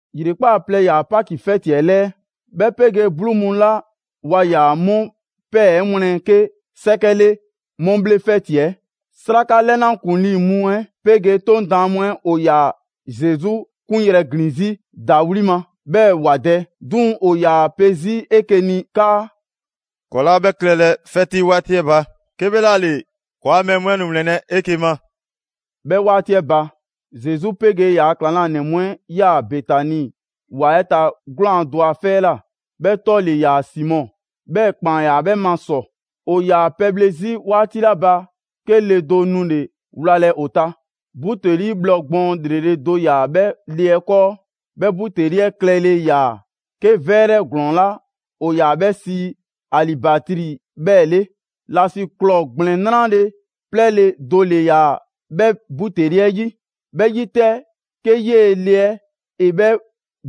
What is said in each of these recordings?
‑Yrekpaa' plɛ ‑yaa Paki 'fɛti yi 'ɛ 'lɛɛ, 'bhɛ 'pegee 'bluu mu 'la waa ‑yaa 'mu ‑pɛɛ 'ɛ wlɛn 'ke 'sɛkɛ 'le 'mu 'bhle 'fɛti 'ɛ. 'Sraka 'lɛna ‑kuŋlii' mu 'ɛ 'pegee 'Toŋ daan mu 'ɛ ‑o ‑yaa Zesu 'kunyrɛ‑ ‑glin 'zi ‑dawli' ma, 'bhɛɛ‑ ‑wa dɛ. 'Duŋ‑, ‑o ‑yaa pe 'zi 'eke‑ ni 'kaa: «‑Kɔɔ' 'laa 'bhɛ klɛlɛ 'fɛti 'waati 'ɛ ba, 'kebhlaale ‑kɔɔa' mɛɛ mu 'ɛ nu ‑wlɛnlɛ' 'eke‑ ma.» 'Bhɛ 'waati 'ɛ ba, Zesu 'pegee ‑yaa ‑klaŋlanɛ mu 'ɛ 'yaa‑ Betani ‑wa 'ɛ ta 'gwlaan‑ do a 'fɛ 'ɛ ꞊la; 'bhɛ 'tɔ ‑le ‑yaa Simɔ, 'bhɛɛ‑ ‑kpaan ‑yaa 'bhɛ ma ‑sɔ. ‑O ‑yaa pɛbhle 'zi 'waati 'la ba, 'ke le do nule‑ wlalɛ ‑o ta. Buteli bhlɔ gbɔɔn ‑lrele' do ‑yaa 'bhɛ le 'ɛ 'kɔɔ, 'bhɛ buteli 'ɛ klɛle ‑yaa 'ke 'vɛrɛ ‑glɔɔn 'la ‑o ‑yaa 'bhɛ sii alibatri 'bhɛɛ‑ 'le. ‑Lasiklɔɔ ‑gblɛn 'nrale‑ 'plɛɛle‑ do ‑le ‑yaa 'bhɛ buteli 'ɛ 'yi. 'Bhɛ 'yi 'tɛ, 'ke 'yee‑ le 'ɛ ‑e 'bhɛ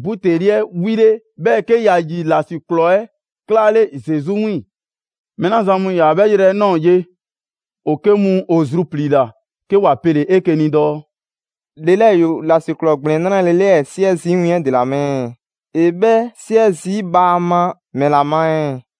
buteli 'ɛ 'wile, 'bhɛɛ‑ 'ke ‑ya ‑yi ‑lasiklɔɔ 'ɛ 'klaale Zesu 'wiiŋ‑. Mɛɛ 'la zan mu ‑yaa 'bhɛ 'yrɛ 'ɛ ꞊nɔɔ ye, ‑o 'ke mu ‑o zrupliila, 'ke ‑wa pele‑ 'eke‑ ni dɔɔ: «Le 'lɛɛ ‑yoo ‑lasiklɔɔ ‑gblɛn 'nrale‑ 'lɛɛ 'siɛ zii' win 'ɛ ‑dela ma ɛɛ? ‑E 'bhɛ 'siɛ zii' bhaama ‑mɛla ma ɛɛ?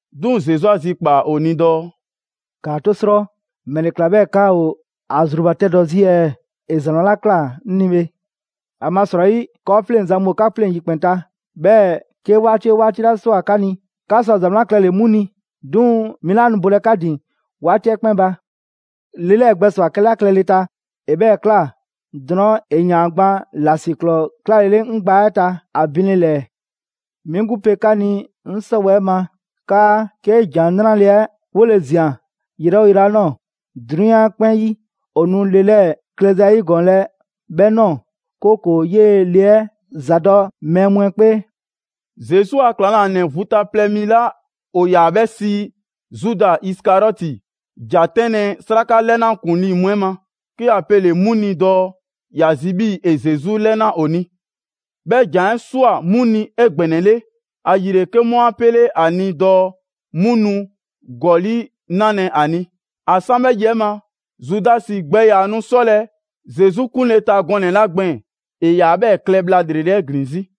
'Duŋ‑ Zesu 'a zikpaa‑ ‑o ni dɔɔ: «‑Kaa 'to 'srɔ! ‑Mɛle ꞊kla 'bhɛɛ‑ 'ka ‑o ‑a zrubatɛdɔ zii' ɛɛ? ‑E ‑za 'wlan ‑la ꞊kla 'ŋ ni bhe. ‑Amasrɔyi, 'kɔɔfleŋzan mu ‑o 'ka 'pleŋ‑ yikpɛn ta, 'bhɛɛ‑ 'ke 'waati 'oo 'waati 'la ꞊swa 'ka ni, 'ka sɔ ‑za 'wlan klɛle‑ 'mu ni, 'duŋ‑ 'mi 'laa nu bolɛ 'ka ‑din 'waati 'ɛ 'kpɛn ba. Le 'lɛɛ gbɛswa‑ 'kɛla klɛle ta, ‑e 'bhɛɛ‑ ꞊kla. Drɔɔn', ‑e ‑yaan gban ‑lasiklɔɔ 'klalele 'ŋ gbaa 'ɛ ta ‑a binle ‑lɛɛ. 'Mi 'gbu pe 'ka ni 'ŋ 'sɔwɛɛ‑ ma 'kaa 'ke ‑Jan 'Nrale‑ 'ɛ 'wole‑ ꞊zian yrɛ 'oo yrɛ 'la ꞊nɔɔ, 'drunyan 'ɛ 'kpɛn 'yi, ‑o nu le 'lɛɛ klɛza 'ɛ 'yigɔɔnlɛ 'bhɛ ꞊nɔɔ, 'kooko‑ 'yee‑ le 'ɛ ‑za dɔ mɛɛ mu 'ɛ 'kpee.» Zesu a ‑klaŋlanɛ vu ta plɛ mi 'la ‑o ‑yaa 'bhɛ sii Zuda Isikariɔti ‑ja 'tɛnlɛ‑ 'Sraka 'lɛna ‑kuŋlii mu 'ɛ ma, 'ke ‑ya pele‑ 'mu ni dɔɔ ‑ya zi 'bhii‑ ‑e Zesu 'lɛna ‑o ni. 'Bhɛ ‑jan 'ɛ ꞊swa 'mu ni 'egbɛnɛle, ‑ayile 'ke 'mu 'a 'pele a ni dɔɔ 'mu nu ‑gɔli' 'nalɛ‑ ‑a ni. ‑A 'san 'bhɛ yi 'ɛ ma, Zudasi gbɛ ‑yaa nu 'sɔlɛ‑ Zesu 'kunle‑ ta gɔnɛ‑ 'la gbɛɛn‑, ‑e ‑yaa 'bhɛɛ‑ klɛ bhla ‑lrele' 'ɛ ‑glin 'zi.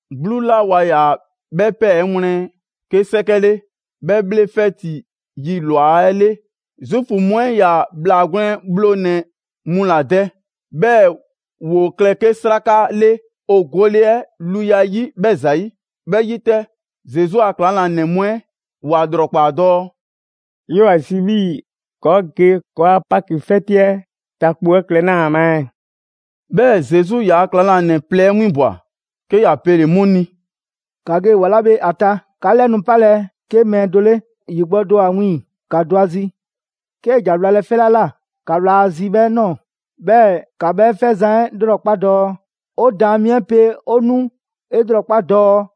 'Bluu 'la waa ‑yaa 'bhɛ ‑pɛɛ 'ɛ wlɛn 'ke 'sɛkɛ 'le, 'bhɛ 'bhle 'fɛti yi ‑lwa 'ɛ 'le, Zuufu mu 'ɛ 'yaa‑ ‑bhlaa gwlɛn bhlonɛ‑ mu ‑la dɛ, 'bhɛɛ‑ ‑woo klɛ 'ke 'sraka 'le ‑o gole 'ɛ luya 'yi 'bhɛ ‑zayi'. 'Bhɛ 'yi 'tɛ, Zesu a ‑klaŋlanɛ mu 'ɛ ‑wa ‑lrɔkpaa dɔɔ: «'Yoo‑ ‑a zi 'bhii‑ ‑kɔɔ' ge ‑kɔɔa' Paki 'fɛti 'ɛ ta kpo 'ɛ klɛ 'naa ma ɛɛ?» 'Bhɛɛ‑ Zesu ‑yaa' ‑klaŋlanɛ plɛ winbwa‑, 'ke ‑ya pele‑ 'mu ni: «‑Ka ge ‑wa 'la bhe ‑a ta, 'ka 'lɛ nu 'palɛ‑ 'ke mɛɛ do 'le, ‑yi gbɔ do ‑o ‑a wiiŋ‑, ‑ka dɔ ‑a zi. 'Kee‑ ‑ja wlalɛ 'fɛ 'la ꞊la, ‑ka wla ‑a zi 'bhɛ ꞊nɔɔ, 'bhɛɛ‑ ‑ka 'bhɛ 'fɛzan‑ 'ɛ lrɔkpa' dɔɔ: ‹'O Daan mi 'ɛ pe 'o nu 'e 'lrɔkpa dɔɔ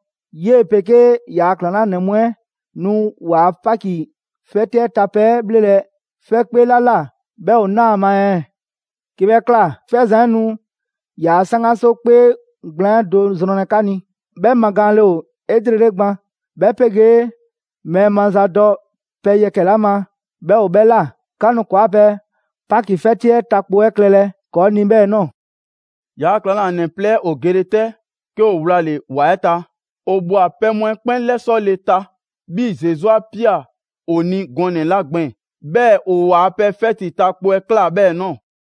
'yee‑ 'pegee ‑yaa' ‑klaŋlanɛ mu 'ɛ nu ‑waa' Paki 'fɛti 'ɛ ta pɛ 'ɛ 'bhlelɛ‑ 'fɛkpee 'la ꞊la 'bhɛ ‑o naa ‑a ma ɛɛ?› 'Ke 'bhɛ ꞊kla, 'fɛzan‑ 'ɛ nu ‑yaa' 'saŋgaso 'kpee gblaan 'ɛ do zrɔnlɛ 'ka ni. 'Bhɛ magaanle ‑o 'elrele gban, 'bhɛ 'pegee mɛɛ mazadɔ pɛ yɛkɛ‑ 'la ma 'bhɛ ‑o 'bhɛ ꞊la. 'Ka nu ‑kɔɔa' pɛ Paki 'fɛti 'ɛ ta kpo 'ɛ klɛlɛ ‑kɔɔ' ni 'bhɛɛ‑ ꞊nɔɔ. ‑Yaa' ‑klaŋlanɛ plɛ 'ɛ ‑o gele 'tɛ, 'ke ‑o wlale‑ ‑wa 'ɛ ta. ‑O ꞊bhwa pɛ mu 'ɛ 'kpɛn 'lɛsɔle ta 'bhii‑ Zesu 'a ꞊pia ‑o ni gɔnɛ‑ 'la gbɛɛn‑. 'Bhɛɛ‑ ‑o ‑waa pɛ 'fɛti ta kpo 'ɛ ꞊kla 'bhɛɛ‑ ꞊nɔɔ.»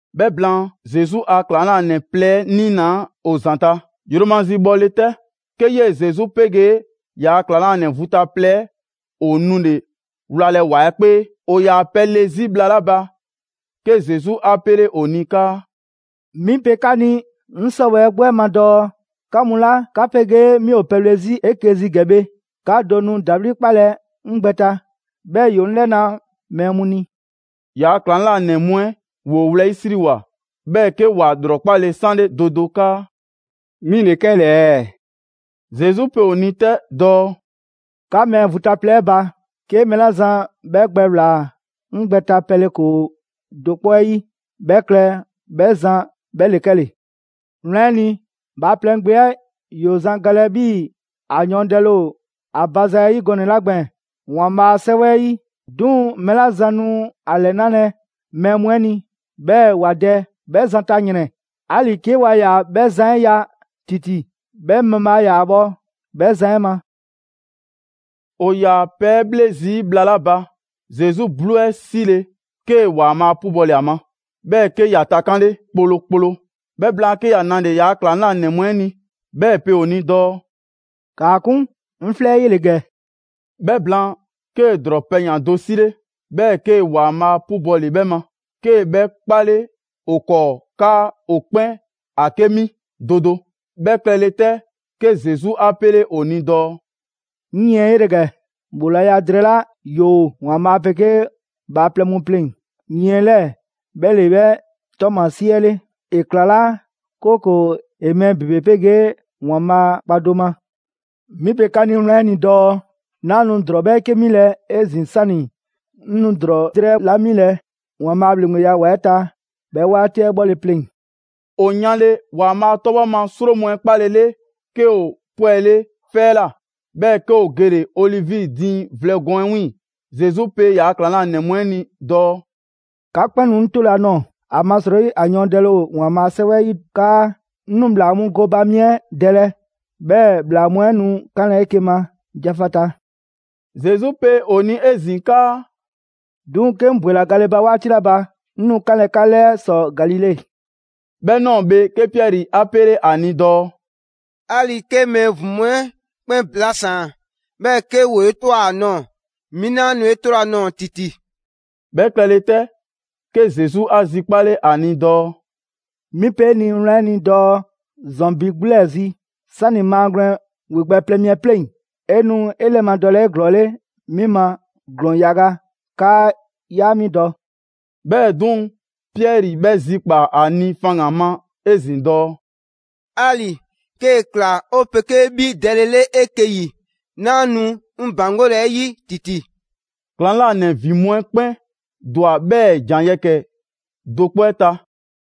'Bhɛ blaan, Zesu a ‑klaŋlanɛ plɛ 'ɛ 'niinaa ‑o ‑zanta'. Yromazi bhɔle 'tɛ, 'ke 'yee‑ Zesu 'pegee ‑yaa' ‑klaŋlanɛ vu ta plɛ 'ɛ ‑o 'nule wlalɛ ‑wa 'ɛ 'kpee. ‑O ‑yaa pɛle 'zi bhla 'la ba, 'ke Zesu 'a 'pele ‑o ni 'kaa: «'Mi pe 'ka ni 'ŋ 'sɔwɛɛ‑ 'gbu 'ɛ ma dɔɔ 'ka mu 'la 'ka 'pegee 'mi ‑o pɛbhle 'zi 'eke‑ zi ‑gɛ bhe, 'ka do nu ‑dawli' 'kpalɛ‑ 'ŋ gbɛ ta, 'bhɛɛ‑ ‑yoo 'ŋ 'lɛna mɛɛ mu ni.» ‑Yaa' ‑klaŋlanɛ mu 'ɛ ‑woo wlɛyisriwoa, 'bhɛɛ‑ 'ke ‑wa ‑lrɔkpale 'sanle do do 'kaa: «'Mi ‑le 'kɛle‑ ɛɛ?» Zesu pe ‑o ni 'tɛ dɔɔ: «'Ka mɛɛ vu ta plɛ 'ɛ ba, 'ke mɛɛ 'la zan 'bhɛ gbɛ ꞊wlaa 'ŋ gbɛ ta pɛle ‑koo do 'kpɔ 'ɛ 'yi, 'bhɛ klɛ 'bhɛ zan 'bhɛ ‑le 'kɛle‑. Wlan 'ɛ ni, Bhaaplɛŋ Gbe 'ɛ ‑yoo zan galɛ 'bhii‑ ‑a yɔɔndɛle ‑o ‑a ba zayi' gɔnɛ‑ 'la gbɛɛn‑ ‑Waanbhaa' a 'Sɛwɛ 'ɛ 'yi. 'Duŋ‑ mɛɛ 'la zan nu ‑a ‑lɛnalɛ mɛɛ mu 'ɛ ni, 'bhɛɛ‑ ‑wa dɛ, 'bhɛ zan ta ‑yrɛn! 'Ali‑ 'ke waa ‑yaa 'bhɛ zan 'ɛ ya ‑titi, 'bhɛ mabhaa ‑yaa bhɔ 'bhɛ zan 'ɛ ma.» ‑O ‑yaa pɛ 'ɛ 'bhle zii' bhla 'la ba, Zesu 'bluu 'ɛ 'sile‑, 'kee‑ ‑Waanbhaa' 'pubɔle ‑a ma, 'bhɛɛ‑ 'ke ‑ya takanle kplokplo. 'Bhɛ blaan, 'ke ‑ya nale‑ ‑yaa' ‑klaŋlanɛ mu 'ɛ ni, 'bhɛɛ‑ ‑e pe ‑o ni dɔɔ: «‑Kaa 'kun, 'ŋ 'flɛ 'ɛ 'yele‑ ‑gɛ.» 'Bhɛ blaan, 'kee‑ ‑drɔɔ pɛyan‑ do 'sile, 'bhɛɛ‑ 'kee‑ ‑Waanbhaa' 'pubɔle 'bhɛ ma, 'kee‑ 'bhɛ 'kpale ‑o 'kɔɔ 'kaa ‑o 'kpɛn 'a 'ke 'mi do do. 'Bhɛ klɛle 'tɛ, 'ke Zesu 'a 'pele ‑o ni dɔɔ: «'Ŋ yiɛn 'ɛ 'yele‑ ‑gɛ, ‑bhoolaya drɛɛ 'la ‑yoo ‑Waanbhaa' 'pegee bhaaplɛŋ mu pleŋ‑, yiɛn 'lɛɛ‑ 'bhɛ ‑le 'bhɛ ‑tɔɔmasie 'ɛ 'le, ‑e ‑klalaa', 'kooko‑ ‑e mɛɛ ‑bebe 'pegee ‑Waanbhaa' kpa do ma. 'Mi pe 'ka ni wlan 'ɛ ni dɔɔ 'naa nu ‑drɔɔ 'bhɛɛke 'milɛ‑ 'ezin‑ 'sani‑ 'ŋ nu ‑drɔɔ drɛɛ 'la 'milɛ‑ ‑Waanbhaa' a ‑bhleŋgbeya ‑wa 'ɛ ta 'bhɛ 'waati 'ɛ 'bhɔle‑ pleŋ‑.» 'O yanle ‑Waanbhaa' 'tɔbhɔ ma 'sro mu 'ɛ 'kpalele, 'ke ‑o 'pwɛle 'fɛ 'ɛ ꞊la, 'bhɛɛ‑ 'ke ‑o gele‑ Olivi diiŋ vlɛ gɔɔn 'ɛ 'wiiŋ‑. Zesu pe ‑yaa' ‑klaŋlanɛ mu 'ɛ ni dɔɔ: «'Ka 'kpɛn nu 'ŋ 'tolɛ‑ a ꞊nɔɔ, ‑amasrɔyi ‑a yɔɔndɛle ‑o ‑Waanbhaa' a 'Sɛwɛ 'ɛ 'yi 'kaa: ‹'Ŋ nu ‑bhlaa mu gooba mi 'ɛ dɛlɛ, 'bhɛɛ‑ ‑bhlaa mu 'ɛ nu 'kanlɛ‑ 'eke‑ ma jafata.›» Zesu pe ‑o ni 'ezin‑ 'kaa: «'Duŋ‑ 'ke 'ŋ ‑bwela gale ba 'waati 'la ba, 'ŋ nu 'kanlɛ‑ 'ka 'lɛɛ ‑sɔ Galile.» 'Bhɛ ꞊nɔɔ bhe, 'ke Piɛri 'a 'pele 'a ni dɔɔ: «'Ali‑ 'ke mɛɛ ‑vin mu 'ɛ 'kpɛn blasaan‑, 'bhɛɛ‑ 'ke ‑woo 'e ꞊twa ‑a nɔɔ‑, 'mi 'naa nu 'e 'tolɛ‑ a ꞊nɔɔ ‑titi.» 'Bhɛ klɛle 'tɛ, 'ke Zesu 'a zikpale ‑a ni dɔɔ: «'Mi pe 'e ni wlan 'ɛ ni dɔɔ: ‑zɔn ‑bi 'gbu 'lɛɛ zi, 'sani maagwlɛn ‑wegbɛ' plɛ mi 'ɛ 'pleŋ‑, 'e nu 'e 'lɛmadɔlɛ 'eglɔɔle 'mi ma ‑glɔɔn yaga 'kaa 'yaa mi dɔ.» 'Bhɛɛ‑ 'duŋ‑, Piɛri 'bhɛ zikpaa‑ ‑a ni faŋgan‑ ma 'ezin‑ dɔɔ: «'Ali‑ 'kee‑ ꞊kla 'o 'pegee 'bhi dɛle 'le 'eke‑ 'yi, 'naa nu 'ŋ ‑baŋgolɛ 'e 'yi ‑titi.» ‑Klaŋlanɛ ‑vin mu 'ɛ 'kpɛn ‑dwa 'bhɛɛ‑ ‑jan yɛkɛ‑ do 'kpɔ 'ɛ ta.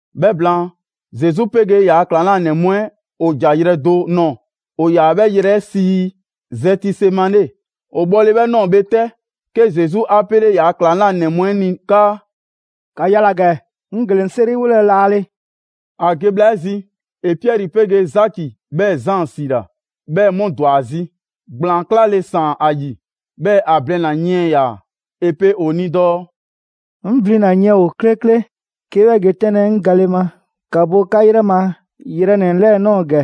'Bhɛ blaan, Zesu 'pegee ‑yaa' ‑klaŋlanɛ mu 'ɛ ‑o ‑ja yrɛ do nɔɔ‑, ‑o ‑yaa 'bhɛ yrɛ 'ɛ sii Zɛtisemane. ‑O bhɔle 'bhɛ ꞊nɔɔ bhe 'tɛ, 'ke Zesu 'a 'pele ‑yaa' ‑klaŋlanɛ mu 'ɛ ni 'kaa: «‑Ka yala‑ ‑gɛ, 'ŋ gele‑ 'ŋ 'seriwolɛ laale.» ‑A ge bhla 'ɛ zi, ‑e Piɛri 'pegee Zaki 'bhɛɛ‑ Zaan 'siila‑, 'bhɛɛ‑ 'mu ‑dwa ‑a zi. ‑Gblaan 'klale ‑saan ‑a ‑yi, 'bhɛɛ‑ ‑a blina‑ yiɛn ‑yaa. ‑E pe ‑o ni dɔɔ: «'Ŋ 'blina‑ yiɛn ‑o 'klekle 'ke 'bhɛ ge 'tɛnlɛ‑ 'ŋ gale ma. ‑Ka bo 'ka 'yrɛ ma yrɛnɛ‑ 'lɛɛ‑ ꞊nɔɔ ‑gɛ!»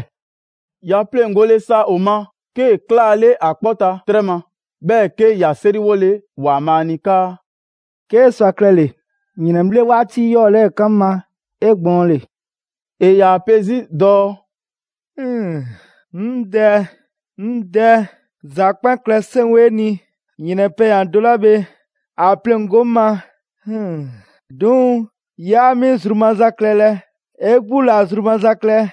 ‑Ya pleŋgole sa ‑o ma, 'kee‑ 'klaale ‑a 'kpɔ ta 'trɛ ma, 'bhɛɛ‑ 'ke ‑ya 'seriwole ‑Waanbhaa' ni 'kaa: «'Kee sɔ a klɛle‑, ‑yrɛnbhle' 'waati 'yɔɔ‑ 'lɛɛ 'kan 'ŋ ma 'egbɔɔnle.» ‑E ‑yaa pe 'zi dɔɔ: «'Ŋ Dɛ, 'ŋ Dɛ, ‑za 'kpɛn klɛ 'seŋ ‑o 'e ni. ‑Yrɛn pɛyan‑ do 'la bhe ‑a pleŋgo 'ŋ ma. 'Duŋ‑ 'yaa 'mi zru maza klɛlɛ, 'e 'gbu ‑la zru maza klɛ.»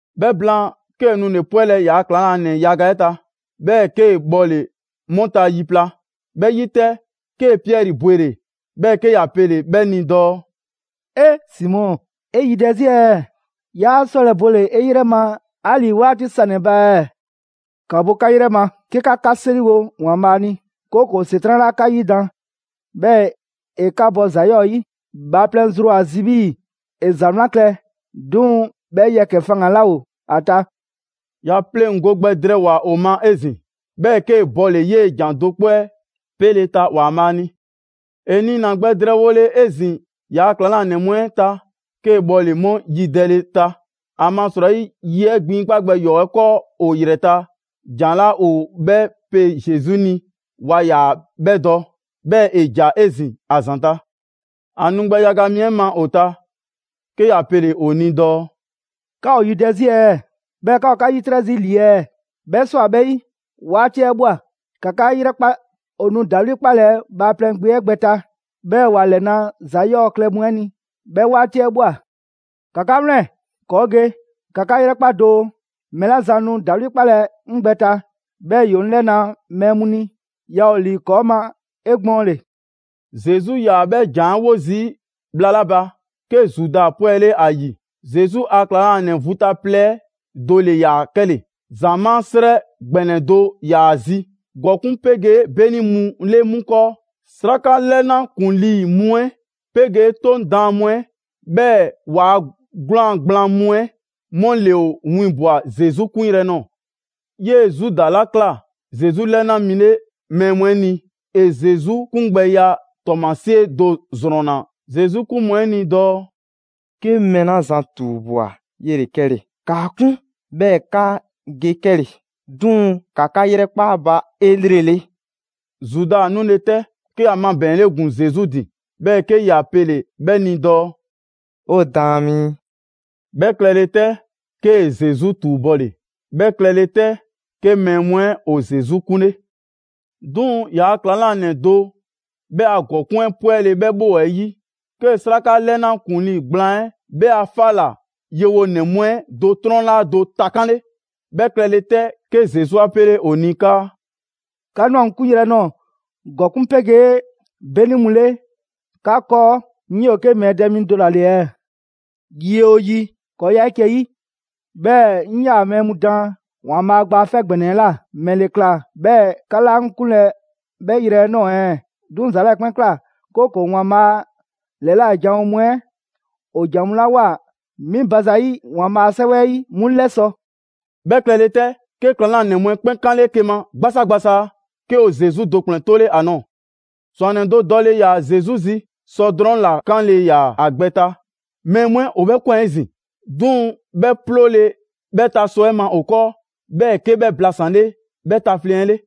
'Bhɛ blaan, 'kee‑ nule‑ 'pwɛlɛ‑ ‑yaa' ‑klaŋlanɛ yaga 'ɛ ta, 'bhɛɛ‑ 'kee‑ bhɔle‑ 'mu ta yi pla. 'Bhɛ 'yi 'tɛ, 'kee‑ Piɛri bwele‑, 'bhɛɛ‑ 'ke ‑ya pele‑ 'bhɛ ni dɔɔ: «Simɔ, 'e yidɛ zii' ɛɛ? 'Yaa 'sɔlɛ‑ bole‑ 'e 'yrɛ ma 'ali‑ 'waati sanɛ‑ ba ɛɛ? ‑Ka bo 'ka 'yrɛ ma, 'ke 'ka 'ka 'seriwo Waanbhaa' ni, 'kooko‑ ‑Setran' 'laa 'ka 'yidan‑, 'bhɛɛ‑ ‑e 'ka bɔ ‑za 'yɔɔ‑ 'yi. Bhaaplɛŋ zru ‑o ‑a zi 'bhii‑ ‑e ‑za 'wlan klɛ, 'duŋ‑ 'bhɛ yɛkɛ‑ faŋgan‑ 'laa ‑o 'ɛ ta.» ‑Ya pleŋgo gbɛ drɛɛwoa‑ ‑o ma 'ezin‑, 'bhɛɛ‑ 'kee‑ bɔle‑ 'yee‑ ‑jan do 'kpɔ 'ɛ 'pele‑ ta ‑Waanbhaa' ni. ‑E niina‑ gbɛ drɛɛwole 'ezin‑ ‑yaa' ‑klaŋlanɛ mu 'ɛ ta, 'kee‑ bhɔle‑ 'mu yidɛle ta; ‑amasrɔyi, yi 'ɛ gbinkpa' gbɛ ‑yɔɔ' 'ɛ 'kɔɔ ‑o ‑yrɛ ta, ‑jan 'la ‑o 'bhɛ pe Zesu ni, waa ‑yaa 'bhɛ dɔ. 'Bhɛɛ‑ ‑e ‑ja 'ezin‑ ‑a ‑zanta'. ‑A nu gbɛ yaga mi 'ɛ ma ‑o ta, 'ke ‑ya pele‑ ‑o ni dɔɔ: «'Ka ‑o yidɛ 'zi ɛɛ, 'bhɛɛ‑ 'ka ‑o 'ka 'yitrɛ zii' ‑li ɛɛ? 'Bhɛ ꞊swa 'bhɛ 'yi, 'waati 'ɛ ꞊bhwa. ‑Ka 'ka 'yrɛkpa! ‑O nu ‑dawli' 'kpalɛ‑ Bhaaplɛŋ Gbe 'ɛ gbɛ ta, 'bhɛɛ‑ ‑wa 'lɛna ‑za 'yɔɔ‑ klɛ mu 'ɛ ni, 'bhɛ 'waati 'ɛ ꞊bhwa. ‑Ka 'ka 'wlɛn‑, ‑kɔɔ' ge! ‑Ka 'ka 'yrɛkpa doo, mɛɛ 'la zan nu ‑dawli' 'kpalɛ‑ 'ŋ gbɛ ta, 'bhɛɛ‑ ‑yoo 'ŋ 'lɛna‑ mɛɛ mu ni, yaa ‑o ‑li ‑kɔɔ' ma 'egbɔɔnle.» Zesu 'yaa‑ 'bhɛ ‑jan 'ɛ 'wo zii' bhla 'la ba, 'ke Zuda 'pwɛle ‑a ‑yi. Zesu a klaŋlanɛ vu ta plɛ 'ɛ do ‑le ‑yaa 'kɛle‑. ‑Zamaa' 'srɛ ‑gbɛnɛ do ‑yaa ‑a zi, ‑gɔkuŋ' 'pegee 'beni mu 'le 'mu 'kɔɔ. 'Sraka 'lɛna ‑kuŋlii mu 'ɛ 'pegee 'Toŋ daan mu 'ɛ, 'bhɛɛ‑ ‑waa' 'gwlaan‑ gblaan mu 'ɛ 'mu ‑le ‑o winbwa‑ Zesu 'kunyrɛ‑ ꞊nɔɔ. 'Yee‑ Zuda 'la ꞊kla Zesu 'lɛna mi 'le mɛɛ mu 'ɛ ni, ‑e Zesu 'kungbɛya ‑tɔɔmasie do ‑zrɔnna Zesu 'kun mu 'ɛ ni dɔɔ: «'Ke 'ŋ mɛɛ 'la zan ‑tuubwa 'yele‑ 'kɛle‑. ‑Kaa 'kun 'bhɛɛ‑ 'ka ge 'kɛle‑, 'duŋ‑ ‑ka 'ka 'yrɛkpa 'a ba 'elrele!» Zuda nule 'tɛ, 'ke ‑ya mabɛɛnle ‑gun Zesu ‑din, 'bhɛɛ‑ 'ke ‑ya pele‑ 'bhɛ ni dɔɔ: «'O Daan mi!» 'Bhɛ klɛle 'tɛ, 'kee‑ Zesu ‑tuubɔle. 'Bhɛ klɛle 'tɛ, 'ke mɛɛ mu 'ɛ ‑o Zesu 'kunle. 'Duŋ‑ ‑yaa' ‑klaŋlanɛ do 'bhɛ a ‑gɔkuŋ' 'ɛ 'pwɛle‑ 'bhɛ 'bhoo‑ 'ɛ 'yi, 'kee‑ 'sraka 'lɛna ‑kuŋlii gblaan 'ɛ 'bhɛ a 'fa ‑la yewonɛ mu 'ɛ do 'trɔnlaa do takanle. 'Bhɛ klɛle 'tɛ, 'ke Zesu 'a 'pele ‑o ni 'kaa: «'Ka ꞊nwa 'ŋ 'kunyrɛ‑ ꞊nɔɔ ‑gɔkuŋ' 'pegee 'beni mu 'le 'ka 'kɔɔ, 'ŋ 'yoo‑ 'ke mɛɛ dɛ mi do ‑la ‑le ɛɛ? Yi 'oo yi, ‑kɔɔ 'yaa 'eke‑ 'yi, 'bhɛɛ‑ 'ŋ 'yaa‑ mɛɛ mu daan ‑Waanbhaa' Gba 'Fɛ ‑Gbɛnɛ 'ɛ ꞊la, ‑mɛle ꞊kla 'bhɛɛ‑ 'ka 'laa 'ŋ 'kunlɛ‑ 'bhɛ yrɛ 'ɛ꞊nɔɔ ɛɛ? 'Duŋ‑ ‑za 'lɛɛ‑ 'kpɛn ꞊kla, 'kooko‑ ‑Waanbhaa' ‑lɛla' janwo mu 'ɛ ‑o ‑jan mu 'la ꞊woa 'mi ba zayi' ‑Waanbhaa' a 'Sɛwɛ 'ɛ 'yi 'mu 'lɛsɔ‑.» 'Bhɛ klɛle 'tɛ, 'ke ‑klaŋlanɛ mu 'ɛ 'kpɛn 'kanle 'eke‑ ma 'gbasaa gbasaa, 'ke ‑o Zesu do ‑kplɛn 'tole 'a ꞊nɔɔ. ‑Zwannɛ do dɔle ‑yaa Zesu zi. Sɔ drɔŋ ‑la 'kanle‑ ‑yaa ‑a gbɛ ta. Mɛɛ mu 'ɛ ‑o 'bhɛ ꞊kwan 'ezin‑. 'Duŋ‑ 'bhɛ 'ploole 'bhɛ ta sɔ 'ɛ ma ‑o 'kɔɔ‑, 'bhɛɛ‑ 'ke 'bhɛ blasanle 'bhɛ tafleŋ‑ 'ɛ 'le.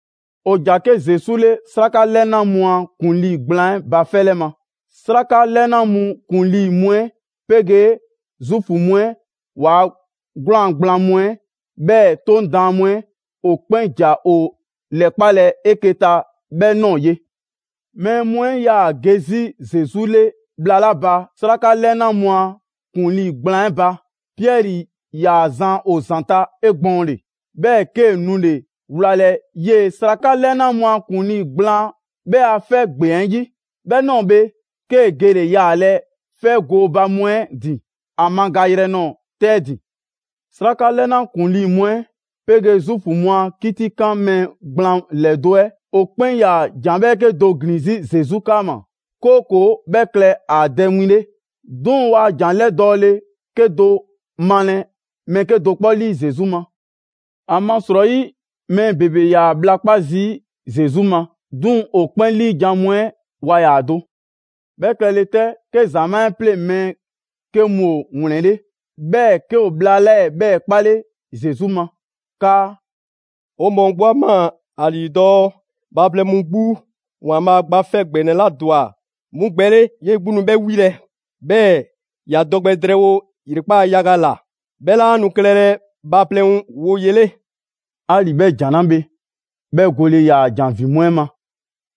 ‑O ‑ja 'ke Zesu 'le 'Sraka 'lɛna mu a ‑kuŋlii gblaan 'ɛ ba 'fɛ 'lɛ ma. 'Sraka 'lɛna mu ‑kuŋlii' mu 'ɛ 'pegee Zuufu mu 'ɛ ‑waa' 'gwlaan‑ gblaan mu 'ɛ, 'bhɛɛ‑ 'Toŋ Daan mu 'ɛ, ‑o 'kpɛn ‑ja ‑o 'lɛkpalɛ 'eke‑ ta 'bhɛ ꞊nɔɔ ye. Mɛɛ mu 'ɛ ‑yaa ge 'zi Zesu 'le bhla 'la ba 'sraka 'lɛna mu a ‑kuŋlii ‑gblaan' 'ɛ ba, Piɛri ‑yaa zan ‑o ‑zanta' 'egbɔɔnle. 'Bhɛɛ‑ 'kee‑ nule‑ wlalɛ 'yee‑ 'sraka 'lɛna mu a ‑kuŋlii gblaan 'bhɛ ‑a 'fɛ ‑gbeŋ 'ɛ 'yi. 'Bhɛ ꞊nɔɔ bhe, 'kee‑ gele‑ yaalɛ 'fɛ gooba mu 'ɛ ‑din ‑a magayrɛ nɔɔ‑ 'tɛ 'ɛ ‑din. 'Sraka 'lɛna ‑kuŋlii mu 'ɛ 'pegee Zuufu mu a 'kitikan mɛɛ gblaan ‑lɛdo' 'ɛ ‑o 'kpɛn 'yaa‑ ‑jan 'bhɛɛke‑ do ‑glin 'zi Zesu 'kaama‑, 'kooko‑ 'bhɛ klɛ ‑a dɛ win 'le. 'Duŋ‑ waa ‑jan 'lɛdɔɔle 'kedo‑ 'male mɛɛ 'kedo‑ 'kpɔ 'lii Zesu ma. ‑Amasrɔyi mɛɛ ‑bebe ‑yaa bhla 'kpa zii' Zesu ma, 'duŋ‑ ‑o 'kpɛn 'liijan‑ mu 'ɛ waa ‑yaa do. 'Bhɛ klɛle‑ 'tɛ, 'ke ‑zamaa' 'ɛ 'pleŋ‑ mɛɛ 'ke mu ‑o ‑wlɛnle', 'bhɛɛ‑ 'ke ‑o bhla 'lɛɛ‑ 'bhɛɛ‑ 'kpale Zesu ma 'kaa: «'O mɔɔ 'gbu 'a ꞊maa ‑a ‑lii dɔɔ bhaaplɛŋ mu 'gbu ‑Waanbhaa' Gba 'Fɛ ‑Gbɛnɛ 'la ‑dwa 'mu gbɛ 'le, 'yee‑ 'gbu nu 'bhɛ 'wilɛ‑, 'bhɛɛ‑ ‑ya dɔ gbɛ drɛɛwo ‑yrekpaa' yaga ‑la; 'bhɛ 'laa nu klɛlɛ bhaaplɛŋ woye 'le.» 'Ali‑ 'bhɛ ‑jan 'la bhe, 'bhɛ gole ‑yaa ‑jan ‑vin mu 'ɛ ma.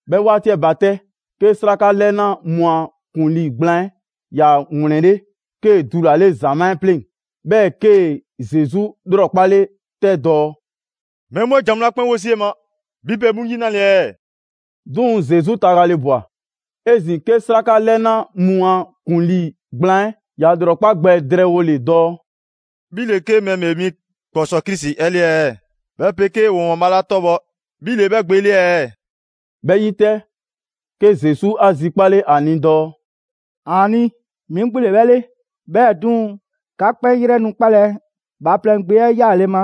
'Bhɛ 'waati 'ɛ ba 'tɛ, 'ke 'sraka 'lɛna mu a ‑kuŋlii gblaan 'ɛ ‑ya ‑wlɛnle', 'kee‑ dulale ‑zamaa' 'ɛ 'pleŋ‑, 'bhɛɛ‑ 'kee‑ Zesu ‑lrɔkpale 'tɛ dɔɔ: «Mɛɛ mu 'ɛ ‑jan mu 'la 'kpɛn 'wo zii' 'e ma, 'bhi pe 'mu 'yi 'nale‑ ɛɛ?» 'Duŋ‑ Zesu tagale ꞊bwa. 'Ezin‑ 'ke 'sraka 'lɛna mu a ‑kuŋlii gblaan 'ɛ ‑ya ‑lrɔkpa' gbɛ drɛɛwole dɔɔ: «'Bhi ‑le 'ke Mɛɛ ‑Bhee mi ‑kpɔsɔɔ Krisi 'ɛ 'le ɛɛ, 'bhɛ 'pegee 'o ‑Waanbhaa' 'la 'tɔbhɔ 'bhi ‑le 'bhɛ Gbe 'le ɛɛ?» 'Bhɛ 'yi 'tɛ, 'ke Zesu 'a zikpale ‑a ni dɔɔ: «‑Aani', 'mi 'gbu ‑le 'bhɛ 'le. 'Bhɛɛ‑ 'duŋ‑, 'ka 'kpɛn 'yrɛ nu 'kpalɛ‑ Bhaaplɛŋ Gbe 'ɛ 'yaale‑ ma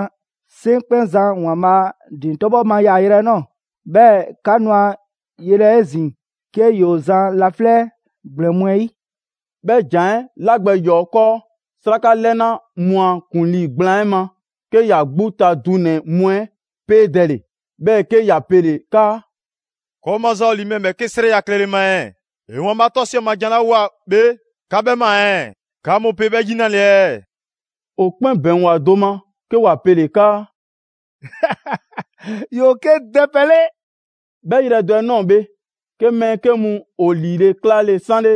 'Seŋkpɛnzan ‑Waanbhaa' ‑din 'tɔbhɔ ma yaayrɛ 'ɛ ꞊nɔɔ. 'Bhɛɛ‑ 'ka nu ‑a yelɛ 'ezin‑ 'ke ‑yoo zan laflɛ' ‑gblɛn mu 'ɛ 'yi.» 'Bhɛ ‑jan 'ɛ 'la gbɛ ‑yɔɔ' 'kɔɔ 'sraka 'lɛna mu a ‑kuŋlii gblaan 'ɛ ma, 'ke ‑ya 'gbu ta dunɛ‑ mu 'ɛ 'peedɛle, 'bhɛɛ‑ 'ke ‑ya pele‑ 'kaa: «‑Kɔɔ' maza ‑o ‑li mɛɛ ‑bhɛɛke' a 'srɛya‑ klɛle ma ɛɛ? ‑E ‑Waanbhaa' 'tɔsiɛ ma jan 'la ꞊woa bhe, 'ka 'bhɛ ꞊maa ɛɛ, 'ka mu pe 'bhɛ 'yi 'nale‑ ɛɛ?» ‑O 'kpɛn ‑bɛŋgwa do ma 'ke ‑wa pele‑ 'kaa: «‑Yoo 'ke dɛpɛ 'le.» 'Bhɛ yrɛ do 'ɛ ꞊nɔɔ bhe, 'ke mɛɛ 'ke mu ‑o ‑liile' 'klale‑ 'sanle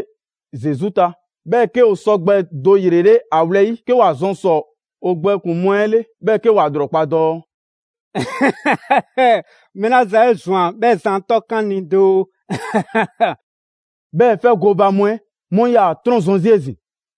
Zesu ta, 'bhɛɛ‑ 'ke ‑o sɔgbɛ do ‑yrele' ‑a wlɛyi', 'ke ‑wa zɔn ‑sɔ ‑o gbɛkpuŋ‑ mu 'ɛ 'le, 'bhɛɛ‑ 'ke ‑wa ‑lrɔkpa' dɔɔ: «Mɛɛ 'la zan 'e ꞊zwan, 'bhɛ zan 'ɛ 'tɔkan 'o ni doo!» 'Bhɛɛ‑ 'fɛ gooba mu 'ɛ 'mu 'yaa‑ ‑a 'trɔnzɔn‑ 'zi 'ezin‑.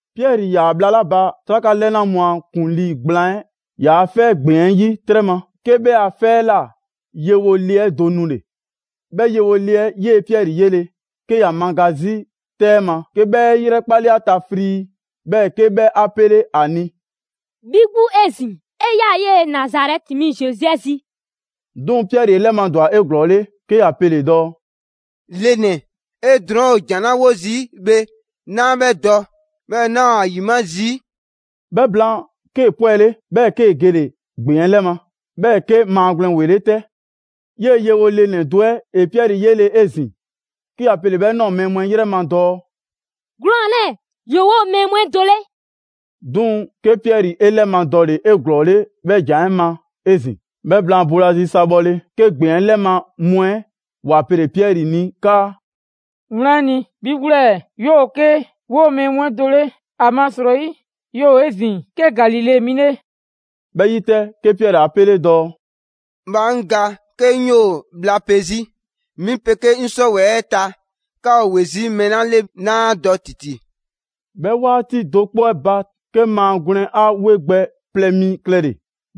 Piɛri ‑yaa bhla 'la ba 'sraka 'lɛna mu a ‑kuŋlii gblaan 'ɛ ‑yaa' 'fɛ ‑gbeŋ 'ɛ 'yi 'trɛ ma, 'ke 'bhɛ a 'fɛ 'ɛ ꞊la yewo le 'ɛ do nule‑. 'Bhɛ yewo le 'ɛ 'yee‑ Piɛri 'yele‑, 'ke ‑ya maga 'zi 'tɛ 'ɛ ma, 'ke 'bhɛ 'e 'yrɛkpale ‑a ta frii, 'bhɛɛ‑ 'ke 'bhɛ 'a 'pele ‑a ni: «'Bhi 'gbu 'ezin‑, 'e 'yaa‑ 'yee‑ Nazarɛti mi Zesu 'ɛ zi.» 'Duŋ‑ Piɛri 'e 'lɛmadwa 'eglɔɔle 'ke ‑ya pele‑ dɔɔ: «Le ‑nɛ, 'e drɔɔn' ‑o ‑jan 'la 'wo zii' bhe, 'naa 'bhɛ dɔ, 'bhɛɛ‑ 'naa ‑o ‑a ‑yima' zii'.» 'Bhɛ blaan, 'kee‑ 'pwɛle, 'bhɛɛ‑ 'kee‑ gele‑ ‑gbeŋ 'ɛ 'lɛ ma. ['Bhɛɛ‑ 'ke maagwlɛn ‑wele' 'tɛ.] 'Yee‑ yewo le ‑nɛ do 'ɛ ‑e Piɛri 'yele‑ 'ezin‑, 'ke ‑ya pele‑ 'bhɛ ꞊nɔɔ mɛɛ mu 'ɛ 'yrɛ ma dɔɔ: «'Gwlaan‑ 'lɛɛ‑ ‑yoo 'woo‑ mɛɛ mu 'ɛ do 'le!» 'Duŋ‑, 'ke Piɛri 'e 'lɛmadɔle 'eglɔɔle 'bhɛ ‑jan 'ɛ ma 'ezin‑. 'Bhɛ blaan boolazi sa bhɔle, 'ke ‑gbeŋ 'ɛ 'lɛ ma mu 'ɛ ‑wa pele‑ Piɛri ni 'kaa: «Wlan 'ɛ ni, 'bhi 'gbu 'lɛɛ‑ 'yoo‑ 'ke 'woo‑ mɛɛ mu 'ɛ do 'le, ‑amasrɔyi 'yoo‑ 'ezin‑ 'ke Galile 'mi 'le!» 'Bhɛ 'yi 'tɛ, 'ke Piɛri ‑a 'pele dɔɔ: «Bhaa 'ŋ ga 'ke 'ŋ 'yoo‑ bhla pe 'zi! 'Mi 'pegee 'ŋ 'sɔwɛɛ‑ 'ɛ ta, 'ka ‑o ‑we 'zi mɛɛ 'la 'le, 'naa 'a dɔ ‑titi!» 'Bhɛ 'waati do 'kpɔ 'ɛ ba 'te, 'ke maagwlɛn 'a 'we gbɛ plɛ mi klɛle‑,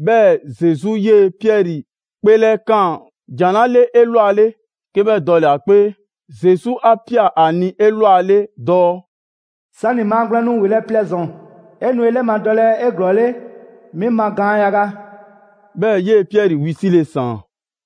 'bhɛɛ‑ Zesu 'yee‑ Piɛri 'kpeelɛkaan ‑jan 'la 'le 'elwale, 'ke 'bhɛ dɔle‑ ‑a 'kpee. Zesu 'a ꞊pia ‑a ni 'elwale dɔɔ: «'Sani‑ maagwlɛn nu ‑welɛ' plɛ ‑zɔn, 'e nu 'e 'lɛmadɔlɛ 'eglɔɔle mi ma gaan yaga.» 'Bhɛɛ‑ 'yee‑ Piɛri wisile ‑saan.